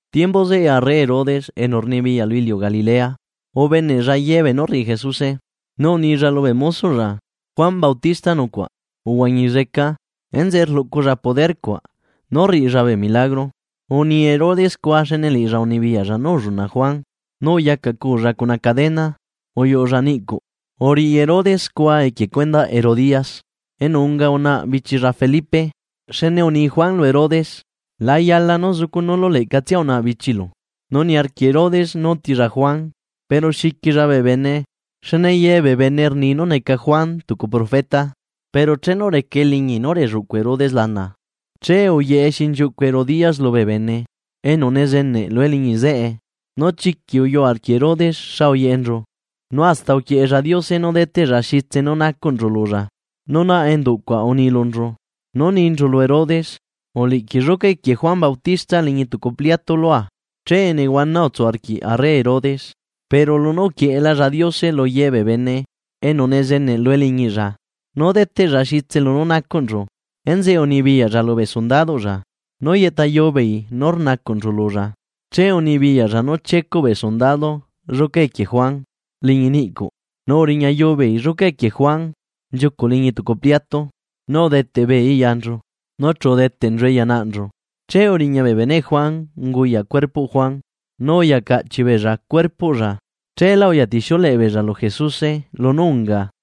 Timbu zeꞌe arre Herodes enu rnibiyaꞌ lu iliu Galilea, ubeneꞌlla ye beenú rriꞌi Jesuse, nu unilla lubee mosoꞌlla: ―Juan Bautista nucuaꞌ, uhuañi zeca. Enzeꞌe rluꞌculla poder cuaꞌ nú rriꞌilla bee milagro. Uni Herodes scua xne liꞌilla unibiyaꞌlla nú ulluna Juan nu uyacaꞌculla cuna cadena uyuꞌulla niꞌcuꞌ. Uriꞌi Herodes scua equie cuendaꞌ Herodías, enu unga unaꞌa bichilla Felipe, xne uni Juan lu Herodes: ―La yala nú zucunuulu leꞌcatsia unaꞌa bichilu. Nu niarquiꞌ Herodes nú utilla Juan, pero xiquilla bee bene, xne ye bee bene rni nú neca Juan tucu profeta. Pero chenu reca eliñi nú relluꞌcu Herodes lana, che uyeꞌe xinchiuꞌcu Herodías lubee bene enu nezeneꞌ lu eliñi zeꞌe, nu chiquiꞌ uyuꞌ arquiꞌ Herodes xa uyeꞌenchu, nu hasta uquieꞌella Diose nú deteꞌlla xitse nú nacuꞌnchu lulla. Nu naꞌ enduꞌ cuaꞌ uni lunchu, nú ninchu lu Herodes: ―Uliꞌquiꞌ lluca equie Juan Bautista liñi tucu pliato lua. Che nehuana utsu arquiꞌ arre Herodes, pero lunú uquieꞌelalla Diose lu ye bee bene enu nezeneꞌ lu eliñiꞌlla nú deteꞌlla xitse lunú nacuꞌnchu, enzeꞌe unibiyaꞌlla lubee sundaduꞌlla nú yeꞌtayu beei nú rnacuꞌnchu lulla. Che unibiyaꞌlla nú chiecuꞌ bee sundadu lluca equie Juan liñi niꞌcuꞌ, nu uriñayu beei lluca equie Juan nchiucuꞌ liñi tucu pliatu, nu udeteꞌ beeii yanchu, nu chu udeteꞌnchue ya naꞌnchu. Che uriña bee beneꞌ Juan unguyaꞌ cuerpoꞌ Juan nu uya caꞌchiꞌ beella cuerpoꞌlla, cheelá uyatixiuleꞌe beella lu Jesuse lunú unga.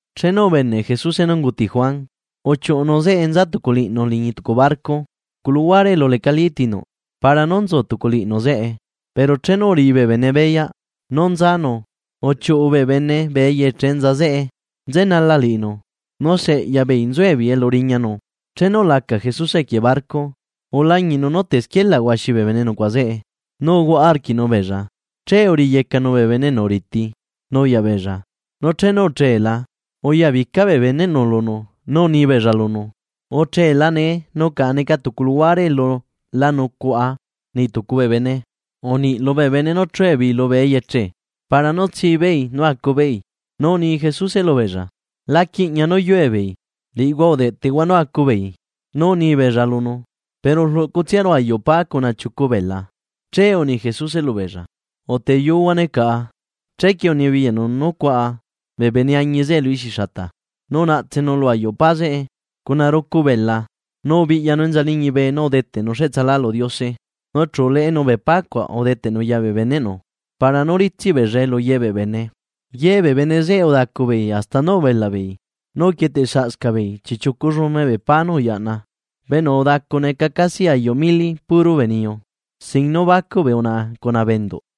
Chenu ubeneꞌ Jesuse nú unguti Juan, uchiuꞌunu zeꞌe nza tuculiꞌnu liñi tucu barco, tucu luhuare elu lecalí tinuꞌ, para nú nzu tuculiꞌnu zeꞌe. Pero chenu uriꞌi bee bene beyaꞌ nú nzanu uchiuꞌu bee bene bee eyeche enza zeꞌe nzenala liꞌinu nu se eꞌya beei nzuebeei elu riñanu. Chenu ulaca Jesuse equie barco, ulañiꞌnu nú tesquielaꞌ huaxi bee bene nucuaꞌa zeꞌe nu uhuaꞌa arquiꞌnu beella, che uriyecanu bee bene enu riti nuyaꞌ beella. Nu chenu uchela, uyabica bee beneꞌnu lunu nu uni beella lunu: ―Uchela nee nu caꞌa neca tucu luhuare elu la nucuaꞌa niꞌ tucu bee bene. Uniꞌ lubee bene nú chue beei lubee eyeche para nú tsi beei nú acu beei. Nu uni Jesuse lubeella: ―La quiꞌña nú yue beei, liꞌihua udeꞌtehua nú acu beei. Nu uni beella lunu: ―Pero rluꞌcutsiaru ayuꞌ pa cuna chiucu bela. Che uni Jesuse lubeella: ―Uteyuhuane caꞌa. Chequie unibiyaꞌnu nú cuaꞌa bee bene añi zeꞌe lu ixi xata. Nu unaꞌtsenu lu ayuꞌ pa zeꞌe cuna rucu bela nu ubiꞌyanu enza liñibe nu udeteꞌnu cheꞌtsa lu Diose. Nu chu uleꞌenu bee pa cuaꞌ udeteꞌnu ya bee beneꞌnu para nú ritsiꞌ beellae lu ye bee bene. Ye bee bene zeꞌe udacu beei hasta nú ubelaꞌ beei, nu uquietesaꞌscaꞌ beei chiꞌchiucu llume bee pa nú uyaꞌna. Bee enu udacu neca casi ayuꞌ mili puro bee niyu, sin nú bacuꞌ bee unaꞌa cuna bee enduꞌ.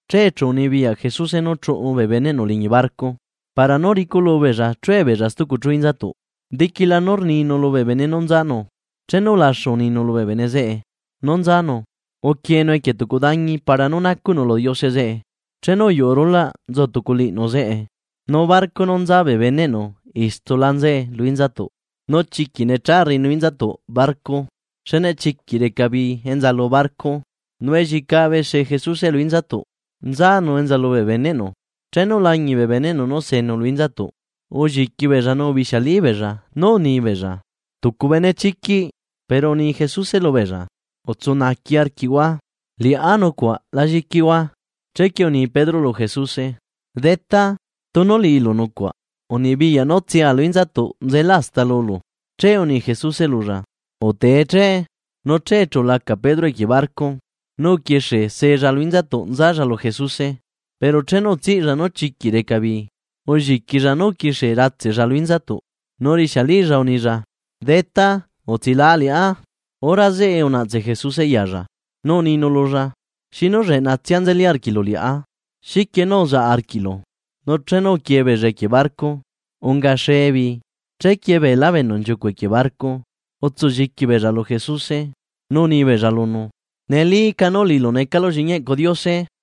Che chu unibiyaꞌ Jesuse nú chuꞌu bee beneꞌnu liñi barco para nú riculubeella chue beella stucu chu inzatuꞌ. Diquila nú rninu lubee bene nú nzanu. Chenu ulaxu uninu lubee bene zeꞌe nú nzanu, uquienu equie tucu dañi para nú nacuꞌnu lu Diose zeꞌe. Chenu uyuꞌu rulaꞌ nzu tuculiꞌnu zeꞌe, nu barco nú nza bee beneꞌnu istula nzae lu inzatuꞌ, nu chiquiꞌ necha rriꞌinu inzatuꞌ barco, xne chiquiꞌ reca bii enza lu barco. Nu elliecabe see Jesuse lu inzatuꞌ, nzanu enza lubee beneꞌnu. Chenu ulañiꞌ bee beneꞌnu nú senu lu inzatuꞌ, ulliqui beella nu ubixialí beella nú uni beella: ―¡Tucu benechiquiꞌ! Pero uni Jesuse lubeella: ―¡Utsu naaqui arquiꞌhua! ¡Liꞌá nucuaꞌ la lliquihua! Chequie uni Pedro lu Jesuse: ―Detá, tunu liꞌilu nucuaꞌ, unibiyaꞌ nú tsea lu inzatuꞌ nzela hasta lulu. Che uni Jesuse lulla: ―Utee che. Nu che chu ulaca Pedro equie barco nu uquixiella sella lu inzatuꞌ nzalla lu Jesuse. Pero chenu utsiꞌlla nú chiquiꞌ reca bii, ulliquilla nu uquixie ratseꞌlla lu inzatuꞌ, nu urixialilla unilla: ―¡Detá, utsilaꞌa liꞌá! Hora zeꞌe unaꞌtse Jesuse yalla, nu uninu lulla: ―¡Xinu lleꞌnatsia nzeli arquiꞌlu liꞌá! ¿Xiquie nú uzaꞌ arquiꞌlu? Nu chenu uquie beella equie barco, ungaxe bii. Chequie beelá bee enu nchiucuꞌ equie barco, utsulliqui beella lu Jesuse nú uni beella lunu: ―¡Nelíca nú liꞌilu necalu lliꞌñi eꞌcu Diose!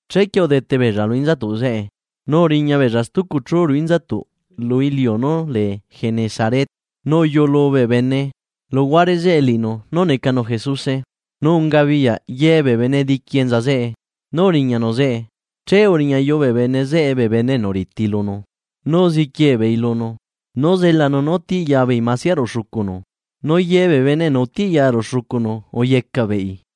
Chequie udete beella lu inzatuꞌ zeꞌe, nu uriña beella stucu chu ruꞌu inzatuꞌ lu iliu nú lee Genesaret. Nu uyuꞌulu bee bene luhuare zeꞌe liꞌinu nú necanu Jesuse, nu ungabiyaꞌ ye bee bene diqui enza zeꞌe nú uriñanu zeꞌe, che uriñayu bee bene zeꞌe bee bene enu riti lunu. Nu uziquie beei lunu nú zelanu nú tiꞌya beei masia ruꞌu xucunu, nu ye bee bene enu utiꞌya ruꞌu xucunu uyecaꞌ beei.